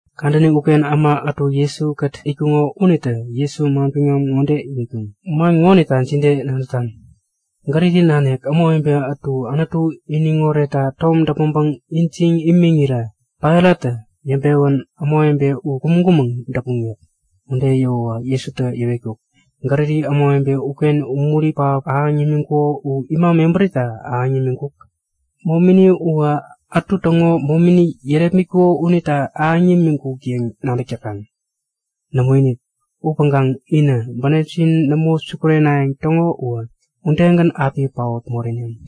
Kadäni uken äma ätu Jesu-kät itkuŋo unitä Jesu manbiŋam ŋode iwetkuŋ; Man ŋonita jide nadätan? Galili nanik ämawebe ätu Anutu iniŋ oretta tom däpmäŋpäŋ ijiŋ imiŋ irirä Pailattä yäŋpewän ämawebe u kumäŋ-kumäŋ däpuŋ yäk. Ude yäwäwä Jesutä yäwetkuk; Galili ämawebe uken umuri pähap ahäŋ yämiŋkuko u ima mebärita ahäŋ yämiŋkuk? Momini uwä ätu täŋo momini yärepmitkuko unita ahäŋ yämiŋkuk yäŋ nadäk täkaŋ? Nämoinik! Upäŋkaŋ inä bänepjin nämo sukurenayäŋ täŋo uwä udegän api paot moreneŋ.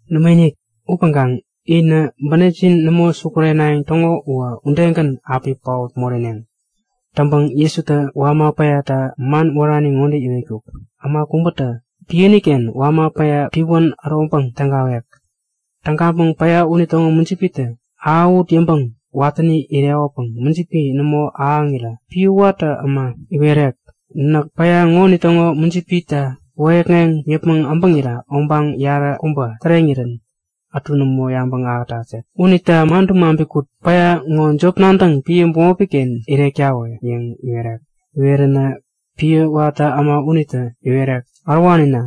Nämoinik! Upäŋkaŋ inä bänepjin nämo sukurenayäŋ täŋo uwä udegän api paot moreneŋ. Täŋpäŋ Jesutä wama päyata man wärani ŋode yäŋkuk; Äma kubätä piäni-ken wama päya piwän äroŋpäŋ tägawek. Tägaŋpäŋ päya unitäŋo mujipitä ahäwut yäŋpäŋ watäni irekopäŋ mujipi nämo ahäŋirä piä watä äma iwerek; Näk päya ŋonitäŋo mujipita wäyäkŋeŋ yäpmäŋ äbäŋira obaŋ yaräkubä täreŋirän ätu nämo yabäŋ ahätat yäk. Unita madäŋ maŋpi kut! Päya ŋo jop-nadäŋ piä bämopi-ken irektawä! yäŋ iwerek. Iweränä piä watä äma unitä iwerek; Ärowanina,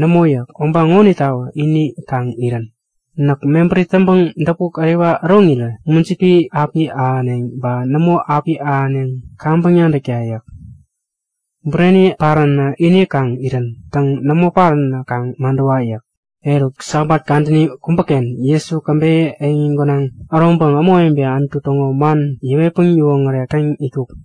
nämo! yäk. Obaŋ ŋonitawä ini kaŋ irän. Näk mebäri täŋpäŋ däpuk äriwa äroŋirä mujipi api ahäneŋ ba nämo ahäneŋ u kaŋpäŋ nadäkta yäk. Bureni paränä ini kaŋ irän. Täŋ, nämo paränä kaŋ madäwa yäk. Eruk, Sabat kadäni kubäken Jesu käbeyä eŋi gänaŋ äroŋpäŋ ämawebe Anutu täŋo man yäwetpäŋ yäwoŋärek täŋ itkuk.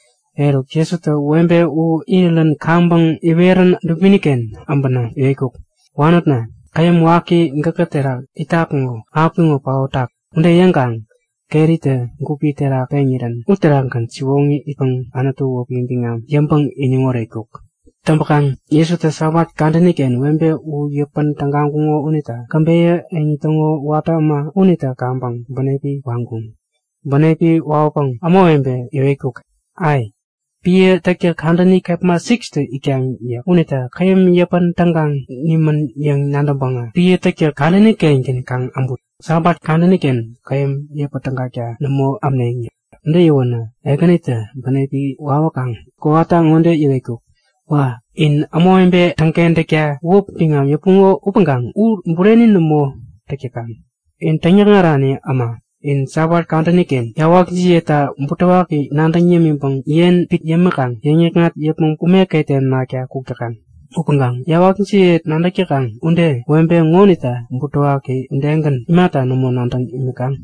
Eruk Jesutä webe u irirän kaŋpäŋ iwerän dubini-ken äbänä iwetkuk; Wanotna, käyäm waki gäkä terak itak ŋo apiŋo paotak! Ude yäŋkaŋ keritä gupi terak peŋirän uterakgän siwoŋi itpäŋ Anutu wäpi biŋam yäŋpäŋ iniŋ oretkuk. Täŋpäkaŋ Jesutä Sabat kadäni-ken webe u yäpän tägaŋkuŋo unita käbeyä eŋi täŋo watä äma unitä kaŋpäŋ bänepi waŋkuŋ. Bänepi wawäpäŋ ämawebe yäwetkuk; Ai! Piä täktäk kadäni kepma 6tä itkaŋ yäk. Unita käyäm yäpän tägaŋ nimän yäŋ nadäŋpäŋä piä täktäk kadäni-kengän kaŋ äbut. Sabat kadäni-ken käyäm yäpä tägakta nämo ämneŋ yäk. Ude yäwänä Ekänitä bänepi wawäkaŋ kowata ŋode iwetkuk; Wa! In ämawebe täŋkentäkta wäp biŋam yäpuŋo upäŋkaŋ u bureni nämo täk täkaŋ. In täŋyäkŋarani äma! In Sabat kadäni-ken yawakjiyeta butewaki nadäŋ yämiŋpäŋ yen pit yämiŋkaŋ yäŋ-yäkŋat yäpmäŋ ume ketem nakta kuk täkaŋ. Upäŋkaŋ yawakjiyeta nadäk täkaŋ ude webe ŋonita butewaki udegän imata nämo nadäŋ imikaŋ?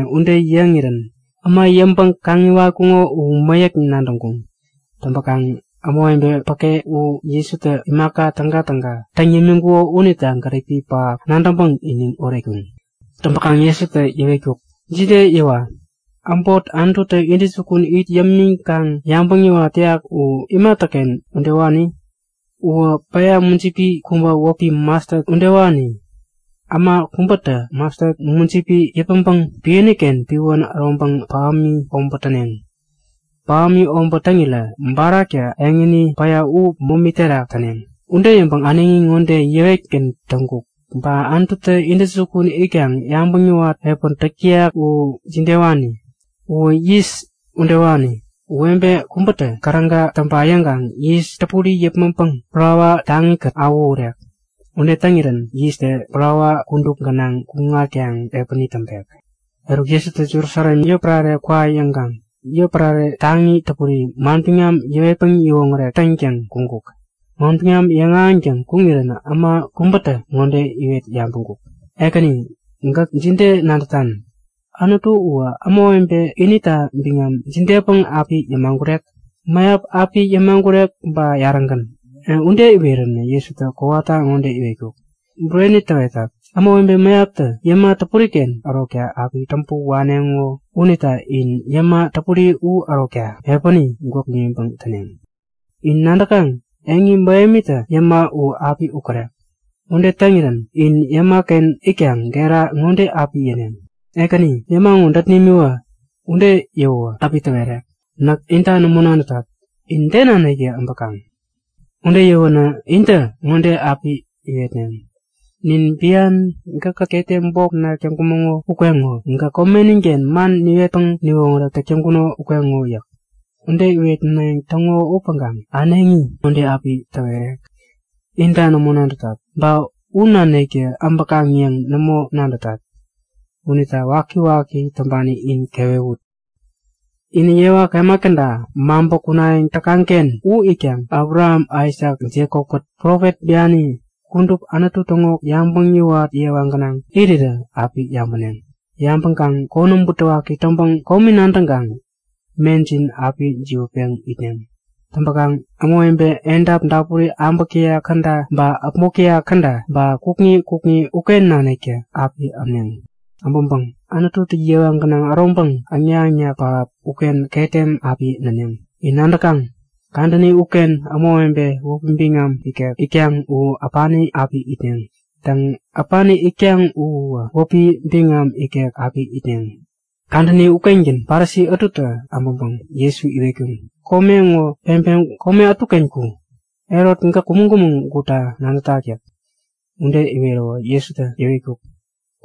Ude yäŋirän äma yäŋpäŋ-kaŋiwatkuŋo u mäyäk nadäŋkuŋ. Täŋpäkaŋ ämawebe päke u Jesutä imaka tägatäga täŋ yämiŋkuko unita gäripi pähap nadäŋpäŋ iniŋ oretkuŋ. Täŋpäkaŋ Jesutä yäwetkuk; Jide yäwa? Äbot Anututä intäjukun it yämiŋkaŋ yabäŋ yäwat täyak u imatäken udewani? Uwä päya mujipi kubä wäpi Mastat udewani. Äma kubätä mastat mujipi yäpmäŋpäŋ piäni-ken piwän äroŋpäŋ pähämi obät täneŋ. Pähämi obät täŋirä baraktä eŋini päya u momi terak täneŋ. Ude yäŋpäŋ äneŋi ŋode yäwetgän täŋkuk; Ba Anututä intäjukun itkaŋ yabäŋ yäwat piä täk täyak u jidewani? Uwä yis udewani. Webe kubätä käräga täŋpa yäŋkaŋ yis täpuri yäpmäŋpäŋ parawa taŋi-kät awähurek. Ude täŋirän yistä parawa kudup gänaŋ kuŋatkaŋ piäni täŋpek. Eruk Jesutä Jerusalem yotpärare kwa yäŋkaŋ yotpärare taŋi täpuri manbiŋam yäwetpäŋ yäwoŋärek täŋtäŋ kuŋkuk. Manbiŋam yäŋahäŋtäŋ kuŋirän äma kubätä ŋode iwet yabäŋkuk; Ekäni! Gäk jide nadätan? Anutu uwä ämawebe inita biŋam jidepäŋ api yäpek? Mäyap api yäpek ba yarägän? Ude iweränä Jesutä kowata ŋode yäwetkuk; Bureni täwetat, ämawebe mäyaptä yäma täpuriken ärokta api täŋpä waneŋo unita in yäma täpuri u ärokta piäni gwäk pimiŋpäŋ täneŋ. In nadäkaŋ? Eŋi mähemitä yäma u api ukärek. Ude täŋirän in yäma-ken itkaŋ gera ŋode api yäneŋ; Ekäni! Yäma ŋo dät nimiwä! Ude yäwäwä api täwerek; Näk inta nämo nadätat. In de naniktä abäkaŋ? Ude yäwänä intä ŋode api iwetneŋ; Nin bian gäkkät ketem bok näk täŋkumäŋo ukeŋo. Gäk komenin-ken man niwetpäŋ niwoŋärek täŋkuno ukeŋo yäk. Ude iwetnayäŋ täŋo upäŋkaŋ äneŋi ŋode api täwerek; Inta nämo nadätat, ba u naniktä äbäkaŋ yäŋ nämo nadätat. Unita wakiwaki täŋpani in kewewut! Inä yewa kemat käda maŋpä kunayäŋ täkaŋ-ken u itkaŋ Abraham, Aisak, Jekop-kät profet biani kudup Anutu täŋo yabäŋ yäwat yewa gänaŋ irirä api yabäneŋ. Yabäŋkaŋ konäm butewaki täŋpäŋ komi nadäŋkaŋ mejin api jiwätpeŋ itneŋ. Täŋpäkaŋ ämawebe edap dapuri äbäk täyak käda ba äpmok täyak käda ba kukŋi kukŋi uken naniktä api ämneŋ. Äbäŋpäŋ Anututä yewa gänaŋ äroŋpäŋ äŋnak-äŋnak pähap uken ketem api näneŋ. In nadäkaŋ? Kadäni uken ämawebe wäpi biŋam ikek itkaŋ u äpani api itneŋ. Täŋ, äpani itkaŋ u uwä wäpi biŋam ikek api itneŋ. Kadäni ukengän Parisi ätutä äbäŋpäŋ Jesu iwetkuŋ; Kome ŋo peŋpeŋ kome ätuken ku! Herot gäk kumäŋ-kumäŋ gutta nadätak yäk. Ude iweräwä Jesutä yäwetkuk;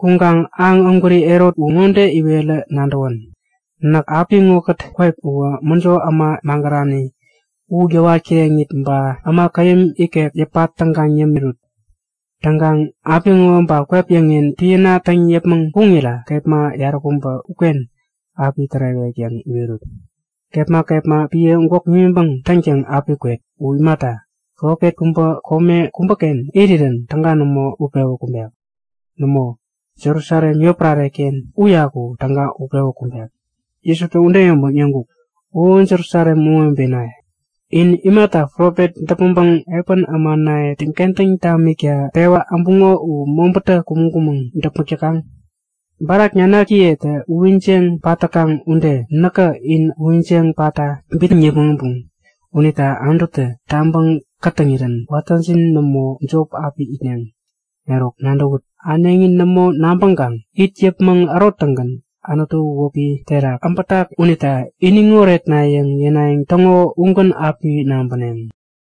Kuŋkaŋ aŋ ägwäri Herot u ŋode iwerä nadäwän. Näk apiŋokät kwep uwä mäjo äma magärani u yäwat kireŋit ba äma käyäm ikek yäpa tägaŋ yämiŋit api täŋpet yäŋ iwerut. Täŋkaŋ apiŋo ba kwep yäŋen piäna täŋ yäpmäŋ kuŋira kepma yaräkubä uken api tärewek yäŋ iwerut. Kepma kepma piä gwäk pimiŋpäŋ täŋtäŋ api kwet. U imata, profet kubä kome kubäken irirän täga nämo utpewä kumbek. Nämo, Jerusalem yotpärare-ken uyaku täga utpewä kumbek. Jesutä ude yäŋpäŋ yäŋkuk; O Jerusalem ämawebenaye! In imata profet däpmäŋpäŋ piä ämanaye täŋkentäŋ tamikta pewa äbuŋo u mobätä kumäŋ-kumäŋ däpmäk täkaŋ? Baraktä nanakiye uyiŋjeŋ pat täkaŋ ude näkä in uyiŋjeŋ patta bitnäŋ yäpmäŋ äbuŋ. Unita Anututä tabä kätäŋirän watäjin nämo, jop api itneŋ. Eruk nadäwut! Äneŋi nämo nabäŋkaŋ it yäpmäŋ äroŋtäŋgän Anutu wäpi terak abätak unita iniŋ oretna! yäŋ yänayäŋ täŋo ugän api nabäneŋ.